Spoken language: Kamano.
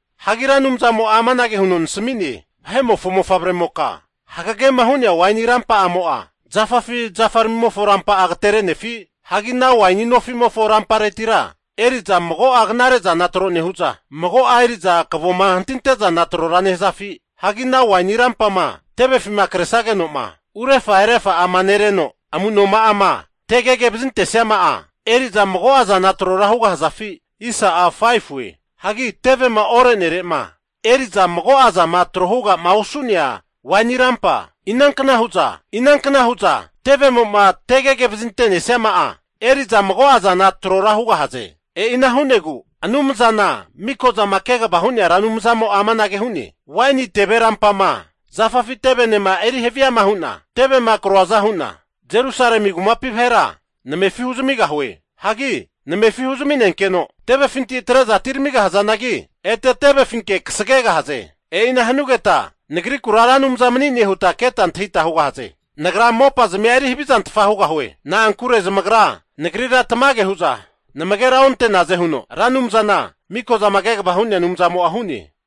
Hagi Ra Anumzamo'a amanage huno nasmi'ne, Vahe'mofo mofavremoka, hagagema hu'nea waini rampa'amo'a zafafi zafaramimofo rampa'a agaterenefi? Hagi ana waini nofimofo ramparetira eri'za mago'a knare'zana tro nehu'za, mago'a eri'za kavoma hantinte'zana trora nehazafi? Hagi ana waini rampama tevefima kresageno'ma urefa erefa'ama nereno amunoma'ama tegege vazintesiama'a eri'za mago'azana trora hugahazafi? Hagi tevema ore'nere'ma eri'za mago'a zama tro huga'ma osu'nea waini rampa, inankna hu'za tevemo'ma tegege vazinte'nesiama'a eri'za mago'azana trora hugahaze? E'ina hu'negu Anumzana Mikozama Kegavama Hu'nea Ra Anumzamo'a amanage hu'ne, Waini teve rampama zafafi tevenema eri haviama hu'na tevema kroaza hu'na Jerusalemi kumapi vahera namefi huzamigahue. Hagi namefi huzminenkeno tevefinti atre'za atiramigahazanagi, ete tevefinke kasagegahaze. E'ina hanugeta Nagrikura Ra Anumza mani'ne huta keta antahita hugahaze. Nagra mopazmia eri havizantfa hugahue. Na'ankure zamagra Nagrira tamage hu'za namagera onte'naze huno Ra Anumzana Mikozama Kegava Hu'nea Anumzamo'a hu'ne.